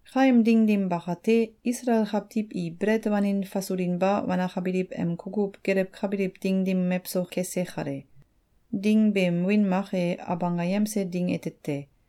Kaem ding dim bakate, Isalael kawtiw i belet wanin fasulinba wanakabiliw em kukuw gelewkabiliw ding dim mewso kese kale. (Ding beem wiin mak e Abanggayemse Ding ete te.)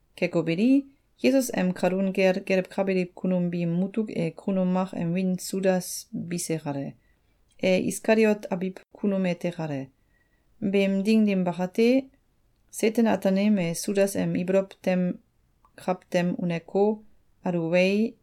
Keko beli, Yesus em kalun kel gelewkabiliw kunum biim mutuk e kunum mak em wiin Sudas bise kale. E Iskaliot abiw kunum ete kale. Beem ding dim bakate, Seten-Ataanim e Sudas em ibolow tem kawtem uneko, aluwei,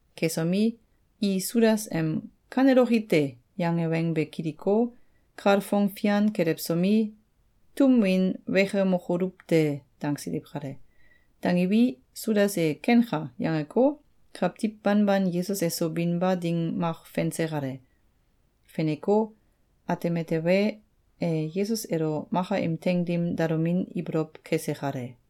Kesomi, i Sudas em “Kaneloki te!”, yange weng be kiliko, kalfong fian kelewsomi, “Tum win wekemokoluw te!”, dangsiliw kale. Dangiwi, Sudas e “Kenka!”, yangeko, kawtiw banban Yesus eso binba ding mak fense kale. Feneko, ateme tewe, e Yesus elo maka im teing dim dalomin ibolow kese kale.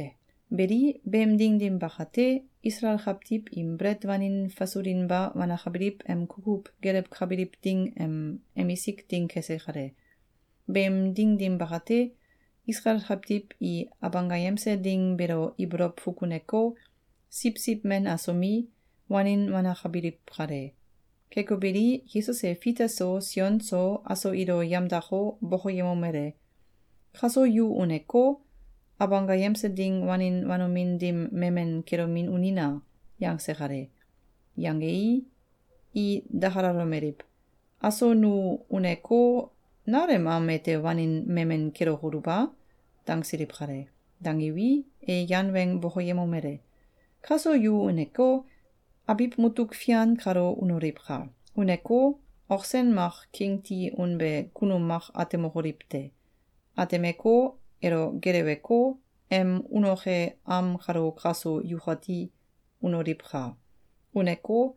Beli, beem ding dim bakate, Isalael kawtiw im belet wanin fasulinba wanakabiliw em kukuw gelewkabiliw ding em emisik ding kese kale. Beem ding dim bakate, Isalael kawtiw i Abanggayemse Ding beelo ibolow fukuneko, siwsiw men asomi, wanin wanakabiliw kale. Keko beli, Yesus e Fita so, Sion so, aso ilo yamdako, bokoyemomele: “Kaso yu uneko, Abanggayemse Ding wanin wanomin dim memen kelomin unina!”, yangse kale. Yangei, i dakalalomeliw: “Aso nu uneko, nal em am ete wanin memen kelokoluw a?”, dangsiliw kale. Dangiwi, e yan weng bokoyemomele: “Kaso yu uneko, abiw mutuk fian kalo unoliwka! Uneko, ok sen mak king ti unbe kunum mak atemokoliw te. Atemeko, elo geleweko, em unoke am kalo kaso yukati unoliwka! Uneko,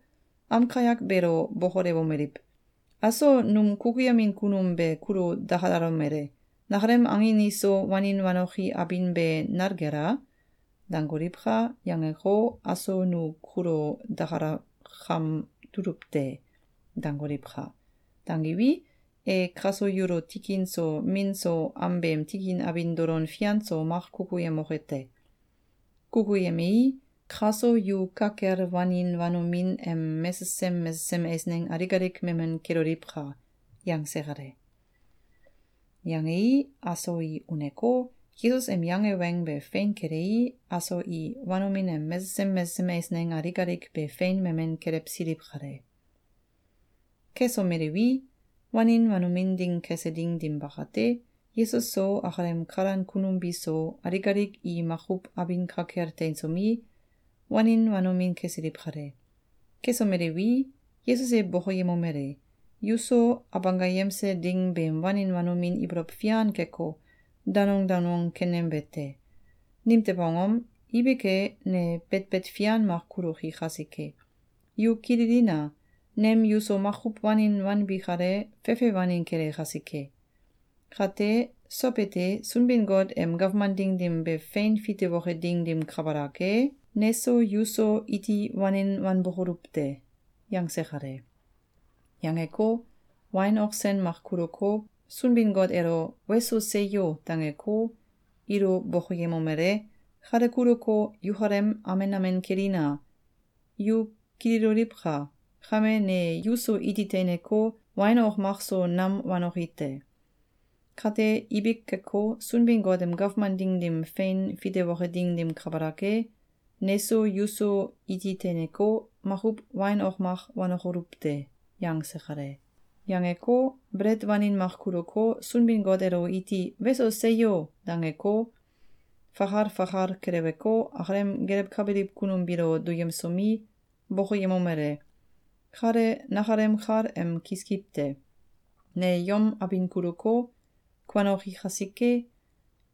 am kayak beelo bokolewomeliw: ‘Aso num kukuyemin kunum be kulo dakalalomele: ‘Nakalem angin iso wanin wanoki abin be nal kel a?’, dangoliwka!’, yangeko, aso nu kulo dakalakam tuluw te.’, dangoliwka! Dangiwi, e kaso yulo tikin so min so am beem tikin abin dolon fian so mak kukuyemoke te. Kukuyemei, kaso yu ka kel wanin wanomin em mesesem mesesem eisneng alik alik memen keloliwka!”, yangse kale. Yangei, aso i uneko, Yesus em yange weng be fein kelei, aso i wanomin em mesesem mesesem eisneng alik alik be fein memen kelewsiliw kale. Kesomeliwi, wanin wanomin ding kese ding dim bakate, Yesus so, akalem kalan kunum biso, alik alik i makuw abin ka kel teinsomi, wanin wanomin kesiliw kale. Kesomeliwi, Yesus e bokoyemomele: “Yuso Abanggayemse Ding beem wanin wanomin ibolow fian keko, danong danong kenembe te. Nimtew angom? Ibik e, ne betbet fian mak kuloki kasike. Yu kililina! Nem yuso makuw wanin wanbi kale, fefe wanin kele kasike. Kate, sow ete, Sunbin-Got em gawman ding dim be fein fitewoke ding dim kabalak e, neso yuso iti wanin wanbokoluw te.”, yangse kale. Yangeko, wain ok sen mak kuluko, Sunbin-Got elo “Weso! Seyo!”, dangeko, ilo bokoyemomele: “Kale kuluko, yukalem amen amen kelina! Yu kililoliwka! Kame, ne yuso iti teineko, wain ok mak so nam wanoki te. Kate, ibik keko, Sunbin-Got em gawman ding dim fein fitewoke ding dim kabalak e, neso yuso iti teineko, makuw wain ok mak wanokoluw te.”, yangse kale. Yangeko, belet wanin mak kuluko, Sunbin-Got elo iti “Weso! Seyo!”, dangeko, fakal fakal keleweko, akalem gelewkabiliw kunum biilo duyemsomi, bokoyemomele: “Kale nakalem kal em kiskiw te. Ne yom abin kuluko, kuanoki kasike,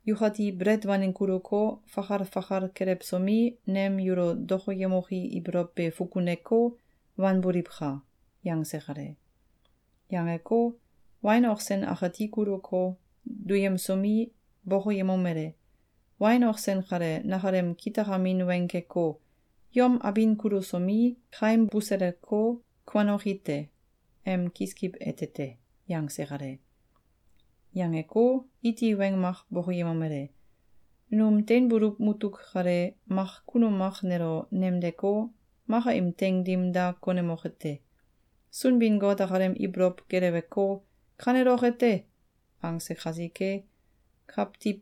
yukati belet wanin kuluko, fakal fakal kelewsomi, nem yulo dokoyemoki ibolow be fukuneko, wanboliwka!”, yangse kale. Yangeko, wain ok sen akati kuluko, duyemsomi, bokoyemomele: “Wain ok sen kale nakalem kitakamin weng keko, ‘Yom abin kulusomi, kaim buseleko, kuanoki te!’ em kiskiw ete te.”, yangse kale. Yangeko, iti weng mak bokoyemomele: “Num teinbuluw mutuk kale, mak kunum mak nelo nemdeko, maka im teing dim da konemoke te. Sunbin-Got akalem ibolow geleweko, ‘Kaneloke te!’, angse kasike, kawtiw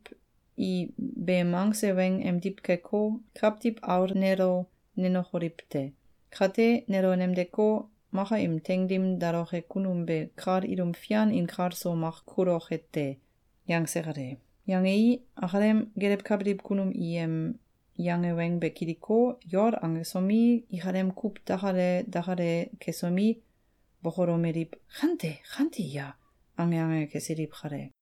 i beem angse weng emdiw keko, Kawtiw Aul nelo nenokoliw te. Kate, nelo nemdeko, maka im teing dim daloke kunum be kal ilum fian inkalso mak kuloke te.”, yangse kale. Yangei, akalem gelewkabiliw kunum i em yange weng be kiliko, yol angesomi, ikalem kuw dakalale dakalale kesomi, bokolomeliw: “Kante? Kante ya?”, ange ange kesiliw kale.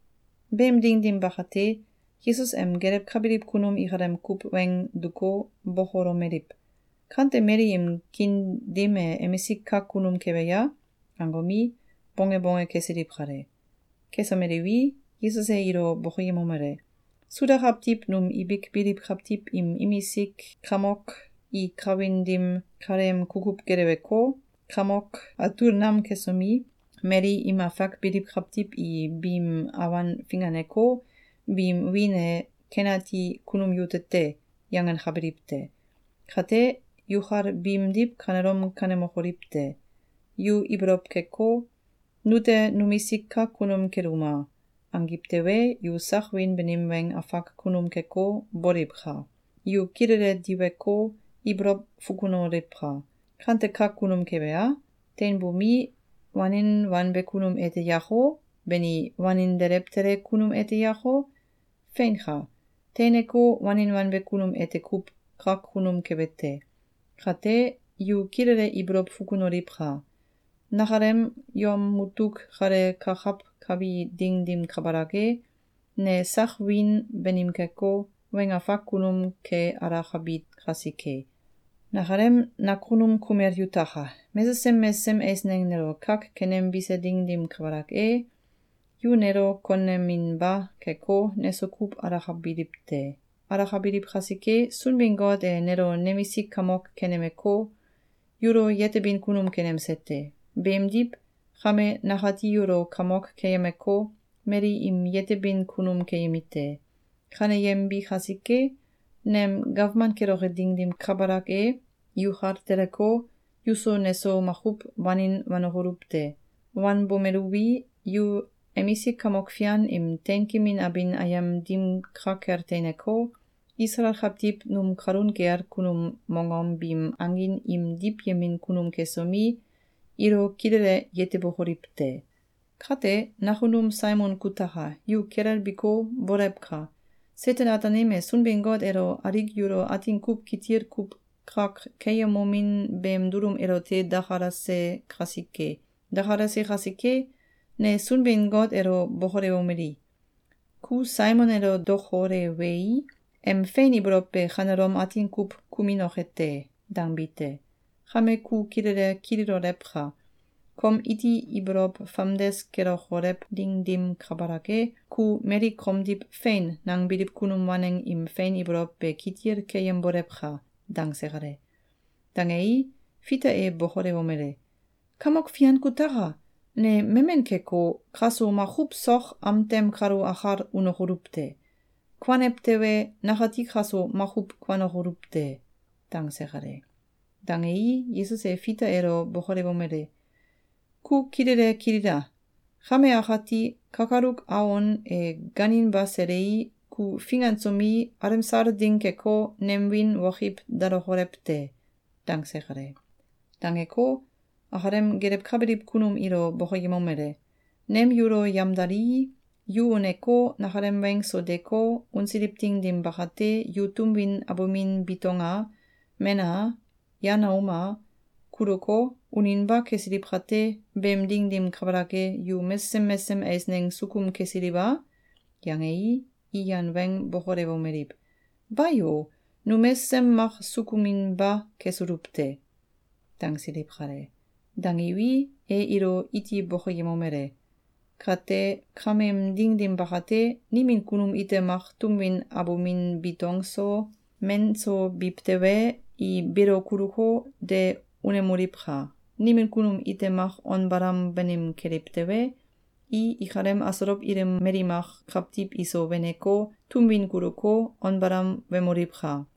Beem ding dim bakate, Yesus em gelewkabiliw kunum ikalem kuw weng duko, bokolomeliw: “Kante mali im kiin dim e emisik kak kunum kebe ya?”, angomi, bonge bonge kesiliw kale. Kesomeliwi, Yesus e ilo bokoyemomele: “Suda kawtiw num ibik biliw kawtiw im imisik kakmok i kawin dim kaleem kukuw geleweko, kamok atul nam kesomi, mali im afak biliw kawtiw i biim awan finganeko, biim wiin e ‘Ken ati kunum yute te!’, yangenkabiliw te. Kate, yukal biimdiw kanelom kanemokoliw te! Yu ibolow keko, ‘Nute numisik kak kunum keluma!’, angiw tewe, yu sak wiin banim weng afak kunum keko, boliwka! Yu kilele diweko, ibolow fukunoliwka! Kante kak kunum kebe a? Teinbomi, wanin wanbe kunum ete yako? Bani, wanin delew tele kunum ete yako? Feinka! Teineko, wanin wanbe kunum ete kuw kak kunum kebe te! Kate, yu kilele ibolow fukunoliwka! Nakalem yom mutuk kale kakawkabi ding dim kabalak e, ne sak wiin banim keko, weng afak kunum ke alakabi kasike. Nakalem nakunum kumel yutaka! Mesesem mesesem eisneng nelo kak kenembise ding dim kabalak e, yu nelo koneminba keko, neso kuw alakabiliw te. Alakabiliw kasike, Sunbin-Got e nelo nemisik kamok kenemeko, yulo yetebin kunum kenemse te. Beemdiw, kame nakati yulo kamok keyemeko, mali im yetebin kunum keyemi te. Kaneyembi kasike, nem gawman keloke ding dim kabalak e, yukal teleko, yuso neso makuw wanin wanokoluw te. Wanbomeluwi, yu emisik kamok fian im teinkemin abin ayem dim ka kel teineko, Isalael kawtiw num kalun kel kunum mongom biim angin im diwyemin kunum kesomi, ilo kilele yetebokoliw te. Kate, nakunum Saimon kutaka! Ku kilelbiko, bolewka! Seten-Ataanim e Sunbin-Got elo alik yulo atin kuw kitil kuw kak keyemomin beem dulum elote dakalase kasike. Dakalase kasike, ne Sunbin-Got elo bokolewomeli: ‘Ku Saimon elo dokolewei, em fein ibolow be kanelom atin kuw kuminoke te!’, dangbi te. Kame ku kilele kililolewka! Kom iti ibolow famdes kelokolew ding dim kabalak e, ku mali komdiw ‘Fein!’, nangbiliw kunum waneng im fein ibolow be kitil keyembolewka!”, dangse kale. Dangei, Fita e bokolewomele: “Kamok Fian kutaka! Ne memen keko, kaso makuw sok am tem kalo akal unokoluw te. Kuanew tewe, nakati kaso makuw kuanokoluw te.”, dangse kale. Dangei, Yesus e Fita elo bokolewomele: “Ku kilele kilila! Kame akati, kakaluk awon e gaaninba selei, ku fingansomi, alemsal ding keko, nem wiin wokiw dalokolew te.”, dangse kale. Dangeko, akalem gelewkabiliw kunum ilo bokoyemomele: “Nem yulo yamdalii, yu uneko, nakalem weng so deeko, unsiliw ding dim bakate, yu tum win abumin bitong a, men a, yan aum a, kuluko, uninba kesiliw kate, beem ding dim kabalak e, yu mesesem mesesem eisneng sukum kesiliw a?”, yangei, i yan weng bokolewomeliw: “Bayo! Nu mesesem mak sukuminba kesuluw te!”, dangsiliw kale. Dangiwi, e ilo iti bokoyemomele: “Kate kameem ding dim bakate, nimin kunum ite mak tum win abumin bitong so, men so biw tewe, i beelo kuluko, de unemoliwka! Nimin kunum ite mak on balam banim keliw tewe, i ikalem asolow ilim mali mak kawtiw iso weneko, tum win kuluko, on balam wemoliwka!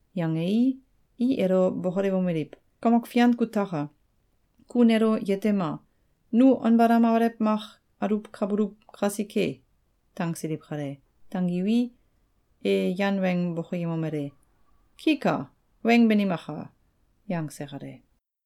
Yangei, i elo bokolewomeliw: “Kamok Fian kuataka! Ku nulo yetema! Nu on balam alew mak aluwkabuluw kasike!”, dangsiliw kale. Dangiwi, e yan weng bokoyemomele: “Ki ka! Weng banimaka!”, yangse kale.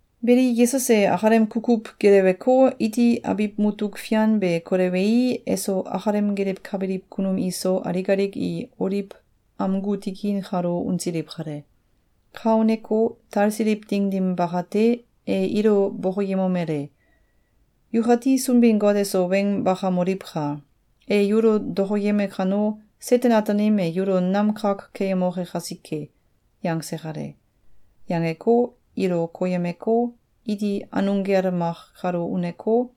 Beli, Yesus e akalem kukuw geleweko, iti abiw mutuk fian be kolewei, eso akalem gelewkabiliw kunum iso, alik alik i Oliw amgu tikin kalo unsiliw kale. Ka uneko, talsiliw ding dim bakate, e ilo bokoyemomele: “Yukati Sunbin-Got eso weng bakamoliwka! E yulo dokoyeme kano, Seten-Ataanim e yulo nam kak keyemoke kasike.”, yangse kale. Yangeko, ilo koyemeko, iti anung gel mak kalo uneko,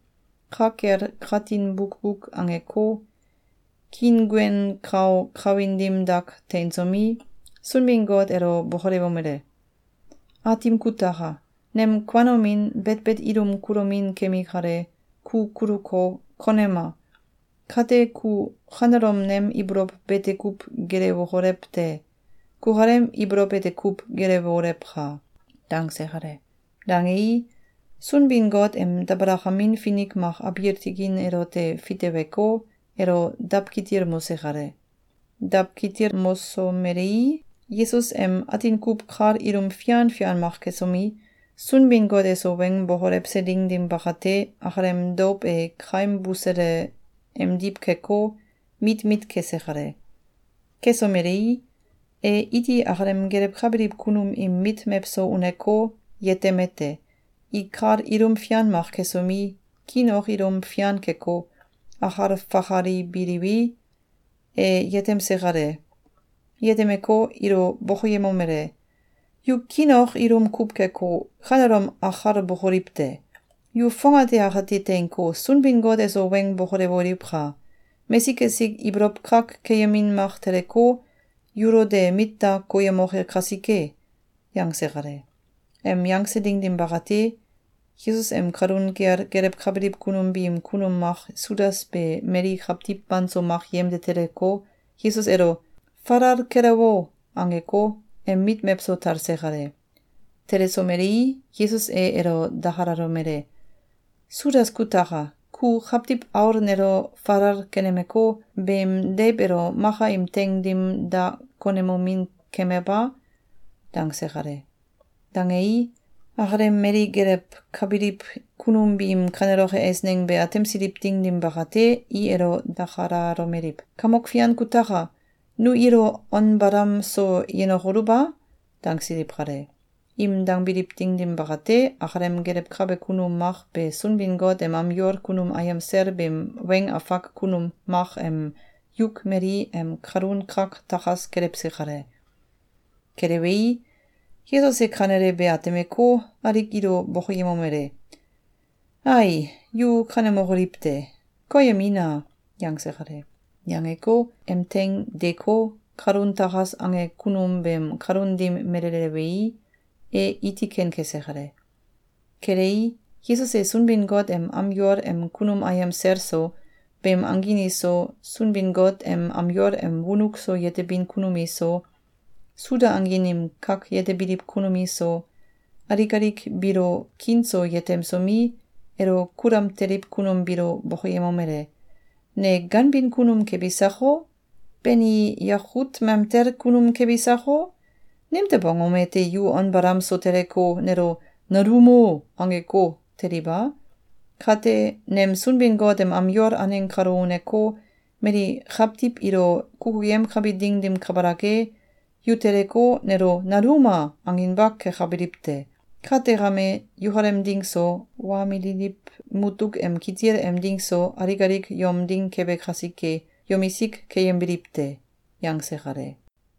ka kel katin bukbuk angeko, kiinguen kau kawin dim dak teinsomi, Sunbin-Got elo bokolewomele: “Aatim kutaka! Nem kuanomin, betbet ilum kulomin kemi kale, ku kuluko, konema! Kate, ku kanelom nem ibolow bete kuw gelewokolew te! Kukalem ibolow ete kuw gelewolewka!”, dangse kale. Dangei, Sunbin-Got em dabalakamin finik mak abiil tikin elote fiteweko, elo dawkitilmose kale. Dawkitilmosomelei, Yesus em atin kuw kal ilum fian fian mak kesomi, Sunbin-Got eso weng bokolewse ding dim bakate, akalem douw e kaim busele emdiw keko, mit mit kese kale. Kesomelei, e iti akalem gelewkabiliw kunum im mit mewso uneko, yetemete: I kal ilum fian mak kesomi, kiin ok ilum fian keko, akal fakalibiliwi, e yetemse kale. Yetemeko, ilo bokoyemomele: “Yu kiin ok ilum kuw keko, kanelom akalbokoliw te! Yu fongate akate teinko, Sunbin-Got eso weng bokolewoliwka! Mesik esik ibolow kak keyemin mak teleko, yulo de mit da koyemoke kasike!”, yangse kale. Em yangse ding dim bakate, Yesus em kalun kel gelewkabiliw kunum biim kunum mak Sudas be mali kawtiw banso mak yemde teleko, Yesus elo “Falal kelewo!”, angeko, em mit mewso talse kale. Telesomelei, Yesus e elo dakalalomele: “Sudas kutaka! Ku Kawtiw Aul nelo falal kenemeko, beem deiw elo maka im teing dim da konemomin kemew a?”, dangse kale. Dangei, akalem mali gelewkabiliw kunum biim kaneloke eisneng be atemsiliw ding dim bakate, i elo dakalalomeliw: “Kamok Fian kutaka! Nu ilo on balam so yenokoluw a?”, dangsiliw kale. Im dangbiliw ding dim bakate, akalem gelewkabe kunum mak be Sunbin-Got em am yol kunum ayem sel beem weng afak kunum mak em yuk mali em kalun kak takas kelewse kale. Kelewei, Yesus e kanele be atemeko, alik ilo bokoyemomele: “Ai, yu kanemokoliw te! Koyemina!”, yangse kale. Yangeko, em teing deeko, kalun takas ange kunum beem kalun dim melelewei, e iti ken kese kale. Kelei, Yesus e Sunbin-Got em am yol em kunum ayem sel so, beem angin iso, Sunbin-Got em am yol em wonuk so yetebin kunum iso, Suda angin im kak yetebiliw kunum iso, alik alik biilo kiin so yetemsomi, elo kulam teliw kunum biilo bokoyemomele: “Ne ganbin kunum kebi sako? Bani, yakut mamtel kunum kebi sako? Nimtew angom ete yu on balam so teleko, nelo ‘Naluumo!’, angeko, teliw a? Kate, nem Sunbin-Got em am yol aneng kalo uneko, mali kawtiw ilo kukuyemkabi ding dim kabalak e, yu teleko, nelo ‘Naluuma!’, anginba kekabiliw te! Kate kame, yukalem ding so, wa mililiw mutuk em kitil em ding so, alik alik yom ding kebe kasike, yomisik keyembiliw te.”, yangse kale.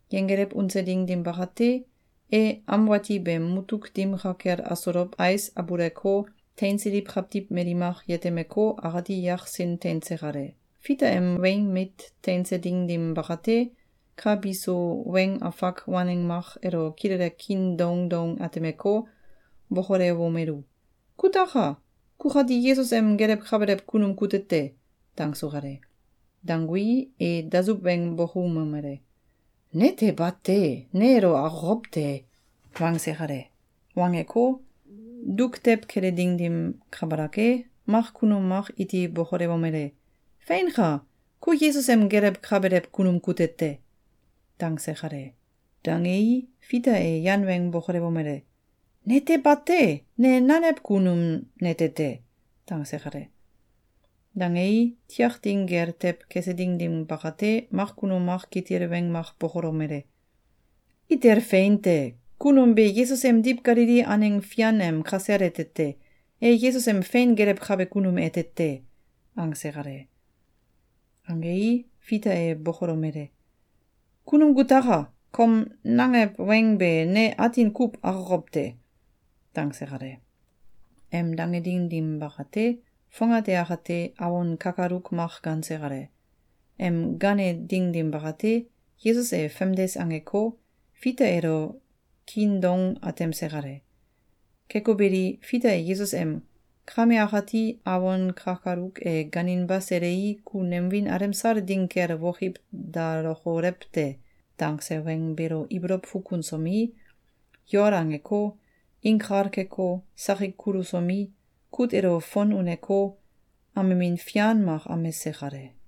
Yenggelew unse ding dim bakate, e am wati beem mutuk dim ka kel asolow ais abuleko, teinsiliw kawtiw mali mak yetemeko, akati yaksin teinse kale. Fita em weing mit teinse ding dim bakate, ka bisu weng afak waneng mak elo kilele kiin doung doung atemeko, bokolewomelu: “Kutaka! Kukati Yesus em gelewkabelew kunum kute te!”, dangsu kale. Dangui, e dasuw weng bokoumomele: “Nete bate! Ne elo akokow te!”, wangse kale. Wangeko, duk tew kele ding dim kabalak e, mak kunum mak iti bokolewomele: “Feinka! Ku Yesus em gelewkabelew kunum kute te!”, dangse kale. Dangei, Fita e yan weng bokolewomele: “Nete bate! Ne nanew kunum nete te!”, dangse kale. Dangei, tiak ding gel tew kese ding dim bakate, mak kunum mak kitil weng mak bokolomele: “Itel fein te! Kunum be Yesus emdiw Galili aneng fian em kasel ete te! E Yesus em fein gelewkabe kunum ete te.”, angse kale. Angei, Fita e bokolomele: “Kunum kutaka! Kom nangew weng be ne atin kuw akokow te.”, dangse kale. Em dange ding dim bakate, fongate akate, awon kakaluk mak gaanse kale. Em gaane ding dim bakate, Yesus e famdes angeko, Fita elo kiin doung atemse kale. Keko beli, Fita e Yesus em “Kame akati, awon kakaluk e gaaninba selei, ku nem wiin alemsal ding kel wokiw dalokolew te!”, dangse weng beelo ibolow fukunsomi, yol angeko, inkal keko, sakik kulusomi, kut elo fon uneko, amemin fian mak amese kale.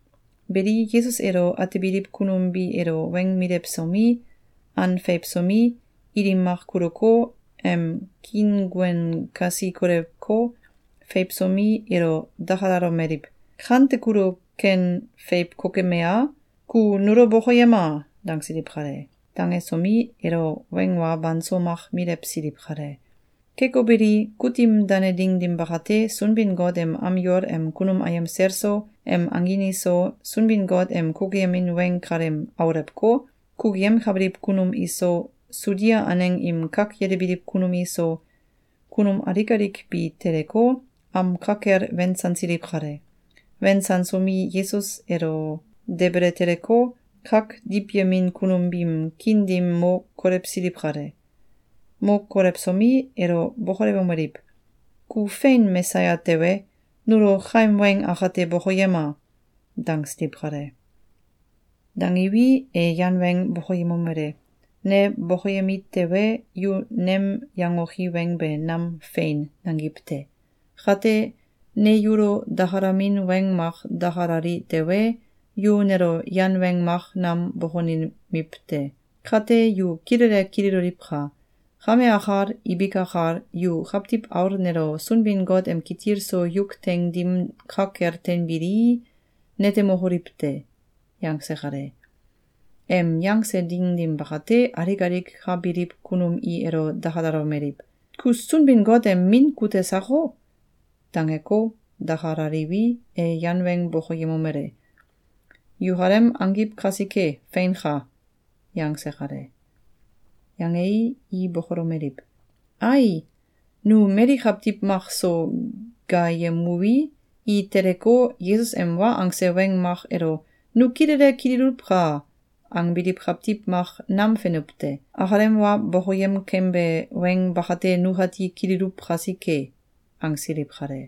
Beli, Yesus elo atebiliw kunum bi elo weng milewsomi, an feiwsomi, ilim mak kuluko, em kiinguen kasi kolewko, feiwsomi, elo dakalalomeliw: “Kante kulo ken feiw kokeme a? Ku nulo bokoyema!”, dangsiliw kale. Dangesomi, elo weng wa banso mak milewsiliw kale. Keko beli, kutim dane ding dim bakate, Sunbin-Got em am yol em kunum ayem sel so, em angin iso, Sunbin-Got em kukuyemin weng kalem aulewko, kukuyemkabiliw kunum iso, Sudia aneng im kak yetebiliw kunum iso, kunum alik alik bi teleko, am ka kel wensansiliw kale. Wensansomi, Yesus elo debele teleko, kak diwyemin kunum biim kiin dim mo kolewsiliw kale. Mo kolewsomi, elo bokolewomeliw: “Ku fein Mesaya tewe, nulo kaim weng akate bokoyema!”, dangsiliw kale. Dangiwi, e yan weng bokoyemomele: “Ne bokoyemi tewe, yu nem yangoki weng be nam ‘Fein!’, nangiw te! Kate, ne yulo dakalamin weng mak dakalali tewe, yu nelo yan weng mak nam bokonemiw te. Kate yu kilele kililoliwka! Kame akal, ibik akal, yu Kawtiw Aul nelo Sunbin-Got em kitil so yuk teing dim ka kel teinbilii, netemokoliw te.”, yangse kale. Em yangse ding dim bakate, alik alik ka biliw kunum i elo dakalalomeliw: “Ku Sunbin-Got em Min kute sako?”, dangeko, dakalaliwi, e yan weng bokoyemomele: “Yukalem angiw kasike, feinka!”, yangse kale. Yangei, i bokolomeliw: “Ai! Nu mali kawtiw mak so gaayemuwi, i teleko, Yesus em wa angse weng mak elo “Nu kilele kililuwka!”, angbiliw kawtiw mak nam fenuw te. Akalem wa bokoyem kembe weng bakate nukati kililuw kasike.”, angsiliw kale.